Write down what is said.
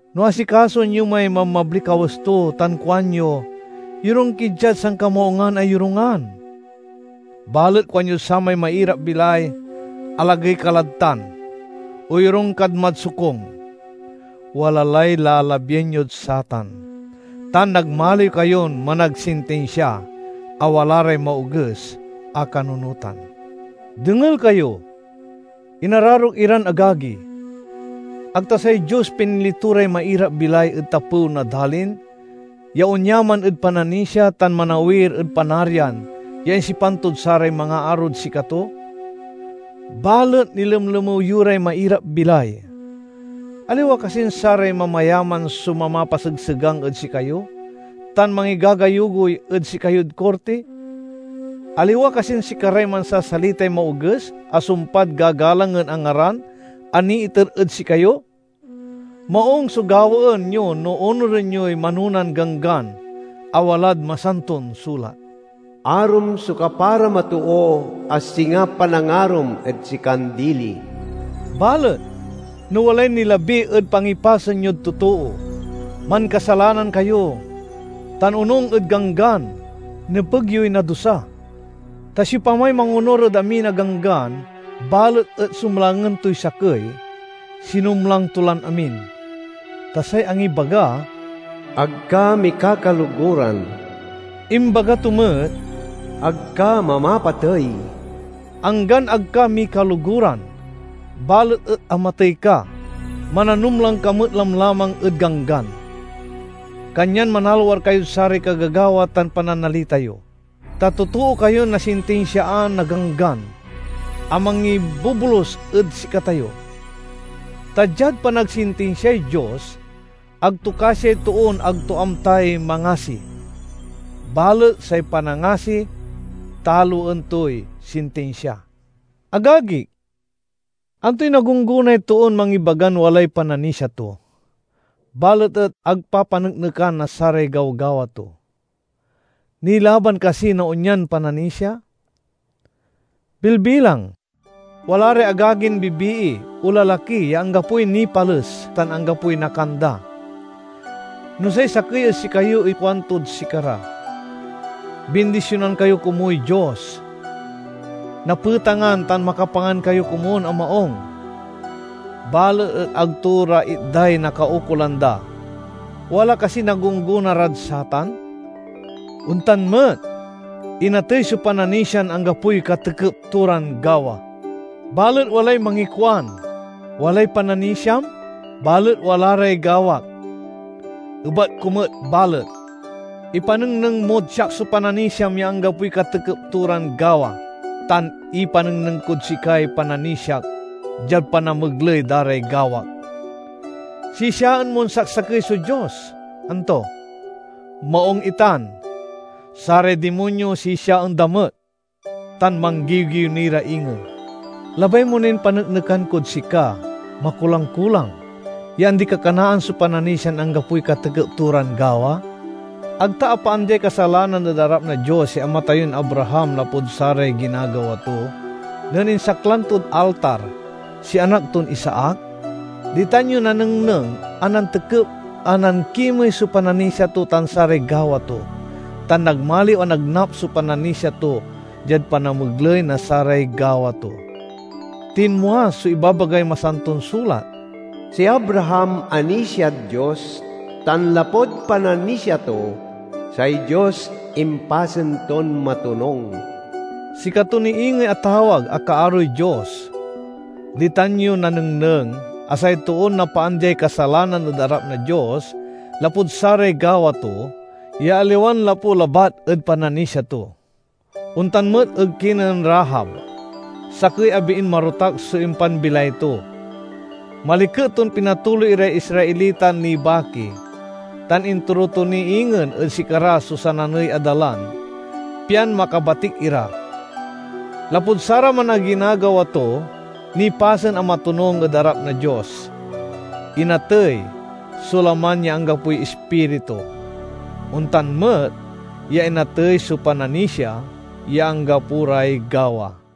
No asikasoen yo may mabmabliy kawes to tan kuanyo: "Yorung ki diad sankamaungan a yorungan," balet kuanyod samay mairap-bilay, "Alagey ka lad tan, o yorung kad mad sokung," wala lay lalabien yod satan, tan nagmaliw kayon managsintinsia a wala ray maoges a kanunotan. Dengel kayo, inararok iran agagi! Ag ta say Dios pinili to ray mairap-bilay ed tapew na dalin ya onyaman ed pananisia tan manawir ed Panarian ya insipan tod saray mangaarod sikato? Balet nilemlemew yo ray mairap-bilay! Aliwa kasin saray mamayaman so mamapasegsegang ed sikayo tan mangigagayugoy ed sikayod korti? Aliwa kasin sikaray mansasalitay maoges a sumpad gagalangen a ngaran a niiter ed sikayo? Maung so gawaen yo no onuren yoy manonan ganggan a walad Masanton Sulat, "Arom so kaparam a too, a singa panangarom ed sikan dili." Balet no walay nilabi ed pangipasen yod totoo mankasalanan kayo tan, onung ed Ganggan, nepeg yoy nadusa. Ta siopamay mangonur ed amin a ganggan balet et sumlangen toy sakey, sinumlang to lan amin. Ta say angibaga, "Ag ka mikakaloguran," imbaga to met, "Ag ka mamapatey." Anggan ag ka mikaloguran balet et amatey ka, mananumlang ka met lamlamang ed ganggan. Kanyan manalwar kayod saray kagagawa tan pananalita yo, ta totoo kayon nasintinsiaan na ganggan a mangibobolus ed sikatayo. Ta diad panagsintinsiay Dios, ag to kasiay toon ag to amtay mangasi; balet say panangasi taloen toy sintinsia. Agagik, antoy nagunggonay toon mangibagan walay pananisia to, balet et ag papaneknekan na saray gawgawa to? Nilaban kasi na onyan pananisia? Bilbilang: wala ray agagin bibii o lalaki ya anggapoy nipales tan anggapoy nakan da. No say sakey ed sikayo ikuantod sikara, "Bindisionan kayo komuy Dios! Napetangan tan makapangan kayo komun a maung!" balet et ag to ra itday nakaukolan da, wala kasiy nagunggona rad satan? Ontan met, inatey so pananisian anggapoy katekep to ran gawa. Balet walay mangikuan, "Walay pananisiam, balet wala ray gawak." Ebat ko met balet, "Ipanengneng mod siak so pananisiam ya anggapoy katekep to ran gawa, tan ipanengneng kod sikay pananisiak diad panamegley da ray gawak." Sisiaen mon saksakey so Dios, anto? Maung itan! Saray dimonyo sisiaen da met, tan manggiwgiw ni ra ingen. Labay mo nin paneknekan kod sika, makulang-kulang, ya andi-kakanaan so pananisian anggapoy katekep to ran gawa? Ag ta apaandiay kasalanan ed arap na Dios si ama tayon Abraham lapud saray ginagawa to, nen insaklang tod altar si anak ton Isaac? Ditan yo nanengneng a nantekep a nankimey so pananisia to tan saray gawa to, tan nagmaliw a nagnap so pananisia to diad panamegley na saray gawa to. Tinmua so ibabagay Masanton Sulat, "Si Abraham anisiad Dios, tan lapud pananisia to, say Dios impasen ton matonung." Sikato ni ingey atawag a kaaroy Dios. Ditan yo nanengneng a say too napaandiay kasalanan ed arap na Dios lapud saray gawa to, ya aliwan lapu labat ed pananisia to. Ontan met ed kinen Rahab, sakey a biin marotak so impanbilay to. Maliket ton pinatuloy iray Israelitan nibaki, tan inturo to ni ingen ed sikara so sananey a dalan pian makabatik ira. Lapud saraman a ginagawa to, nipasen a matonung ed arap na Dios. Inatey so laman ya anggapoy ispiritu; ontan met ya inatey so pananisia ya anggapo ray gawa.